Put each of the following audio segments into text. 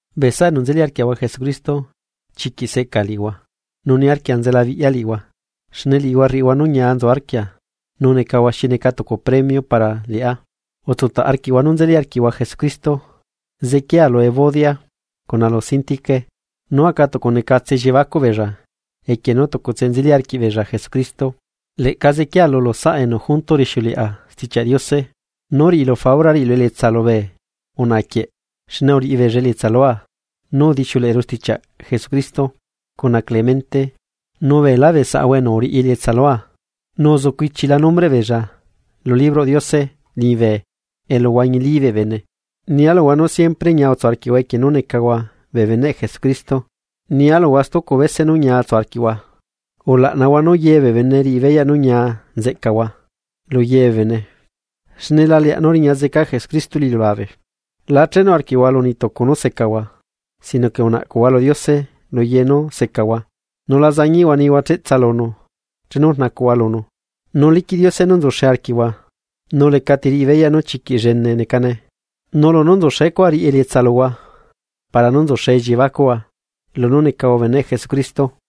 Bee saꞌa enu nzeli arquiaꞌahua Jesucristo, chiquiꞌ seꞌca liꞌihua, nu niarquia nzelabiꞌya liꞌihua, xne liꞌihua rriꞌihua nú ñia nzu arquia nu necahua xi neca tucu premio para liꞌá, utsutaꞌ arquiꞌhua nú nzeli arquiꞌhua Jesucristo. Zequiea lu Evodia, cuna lu Síntique nú aca tucunecatse elliebacuꞌ beella equie nú tucutse nzeli arquiꞌbeella Jesucristo. Leꞌca zequiea lulu saꞌa enu junto rixiuleꞌa Stichiaꞌ Diose, nú riꞌilu faura riꞌilu elietsa lubee unaꞌa quie, xne uriꞌibeella elietsa lua nú udixiuleꞌeru stichiaꞌ Jesucristo, cuna Clemente nu beelá bee saꞌahua enu uriꞌi elietsa lua. Nu nzucu ichila nombreꞌ beella lu libroꞌ Diose liñibe elu huañilí bee bene. Nia luhua nú siempre ñia utsu arquiꞌhua equie nú necahua bee beneꞌ Jesucristo. Nia luhua stucu bese nú ñia utsu arquiꞌhua. Ulaꞌnahua nú ye bee bene riꞌi beyaꞌ nú ñia nzeꞌcahua, lu ye bee bene, xne la leaꞌ nú riña zeca Jesucristo lu iliulabe. La chenu arquiꞌhua lu niꞌtucu nú secahua. Sino que unaꞌcuꞌtsaiahua lu Diose luye nú secahua nu la zañiꞌhua nihua cheꞌtsa lunu chenu rnacuꞌhua lunu. Nu liquiꞌ Diose nú nzuxe arquiaꞌahua nú lecati riꞌi beyaꞌ nu chiquiꞌ llene necane. Nu lunú nzuxe cuaꞌ riꞌi elietsa luhua para nú nzuxe elliebacuꞌhua lunú necahua beneꞌ Jesucristo.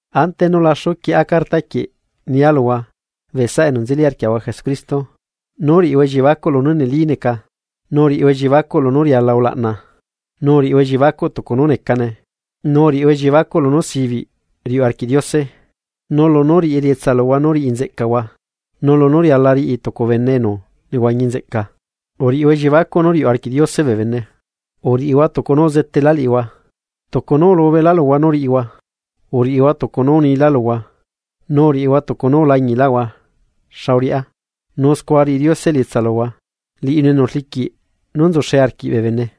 Ante nú laxu quieꞌa carta quieꞌ nia luhua bee saꞌa enu nzeli arquiꞌ Jesucristo, nú riꞌihua elliebacuꞌ lunú neli neca, nu uriꞌihua elliebacuꞌ lunú riala ulaꞌna, nu uriꞌihua elliebacuꞌ tucu nú necane, nu uriꞌihua elliebacuꞌ lunú sibiꞌ riuꞌ arquiꞌ Diose, nu lunú riꞌi elietsa luhua nú riꞌi nzeꞌcahua, nu lunú riala riꞌi tucu bene enu nehuañi nzeꞌca, uriꞌihua elliebacuꞌ nú riuꞌ arquiꞌ Diose bee bene. Uriꞌihua tucu nú uzetela liꞌihua, tucu nú ulubela luhua nú riꞌihua, uriꞌihua tucu nú unila luhua nu uriꞌihua tucu nú ulañiꞌlaꞌhua xa uriꞌá, nu scua riꞌi Diose elietsa luhua liꞌinu enu rliquiꞌ nú nzuxe arquiꞌ bee bene.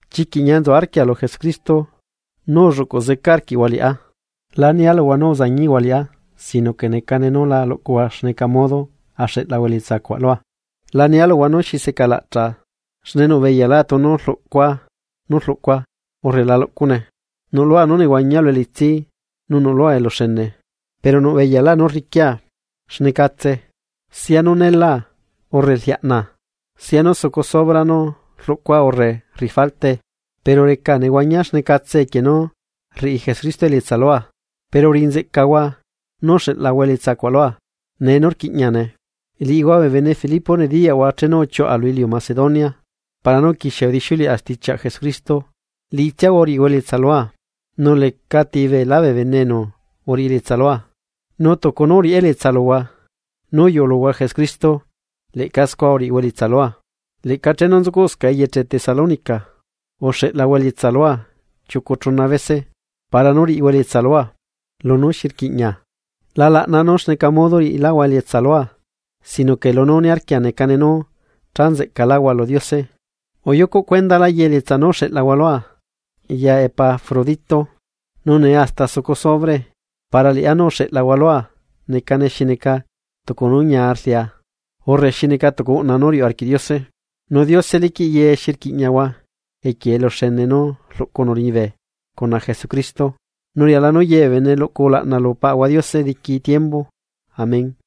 Chiquiꞌ ñia nzu arquia lu Jesucristo nú ulluꞌcuꞌ zeca arquiꞌhua liꞌá. La nia luhua nú uzañiꞌhua liꞌá sino que necane nú lá luꞌcuhua xneca modo axeꞌlahua elietsacuaꞌ lua. La nia luhua nú xi seꞌcalaꞌchaꞌa xne nuꞌbeyalá tunu rluꞌcua nú rluꞌcua urre la luꞌcune. Nuꞌlua nú nehuañia lu elitsi nu nuꞌlua eluxene. Pero nuꞌbeyalá nú rriquia xnecatse sianú neela urre rliaꞌnaa sia nú sucu sobra nú rluꞌcua urre rriꞌi faltae. Pero recaa nehuañia xnecatse equie nú rriꞌi Jesucristo elietsa lua. Pero uriꞌinzeꞌcahua nú uxeꞌlahua elietsa cuaꞌ lua nee nú rquiꞌñiane. Liꞌihua bee bene Filipo nediyaꞌhua chenu uchiuꞌa lu iliu Macedonia, para nú uquixia udixiuleꞌa stichiaꞌ Jesucristo liꞌitsiahua uriꞌihua elietsa lua, nu lecati beelá bee bene enu uriꞌi elietsa lua, nu tucu nú uriꞌá elietsa luhua nú uyuꞌuluhua Jesucristo leꞌca scua uriꞌihua elietsa lua. Leꞌca chenu nzucuꞌscaꞌa eyeche Tesalónica, uxeꞌlahua elietsa lua chiucu chuna bese para nú riꞌihua elietsa lua lunú xi rquiꞌña. La laꞌnaa nú xneca modo riꞌiláhua elietsa lua sino que lunú niarquia necane nú cha nzeꞌcaláhua lu Diose. Uyucuꞌ cuendalá ye elietsa nú uxeꞌlahua lua ya Epafrodito. Nu nee hasta sucu sobrae. Para liꞌá nú uxeꞌlahua lua necane xi neca tucu nú ñia rlia urre xi neca tucu uꞌna nú riuꞌ arquiꞌ Diose. Nu Diose liquiꞌ ye nú xi rquiꞌñahua equie eluxene nú rluꞌcunu liñibe cuna Jesucristo. Nu riala nú yebee bene luꞌcu ulaꞌna lu Paꞌahua Diose diqui tiembu. Amén.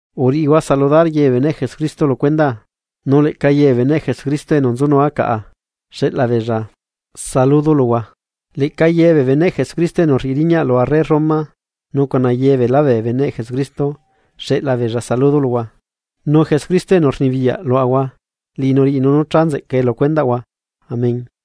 Uriꞌihua saludar yebee beneꞌ Jesucristo lu cuendaa. Nu leꞌca yebee beneꞌ Jesucristo enu nzunua caꞌa xeꞌlabeella saludo luhua. Leꞌca yebee beneꞌ Jesucristo enu rriꞌi riñaꞌ lu arre Roma nu cuna yebeelá bee beneꞌ Jesucristo xeꞌla beella saludo luhua. Nu Jesucristo enu rnibiyaꞌ luaꞌahua liꞌinu riꞌinu nú cha nzeꞌcae lu cuendaꞌhua. Amén.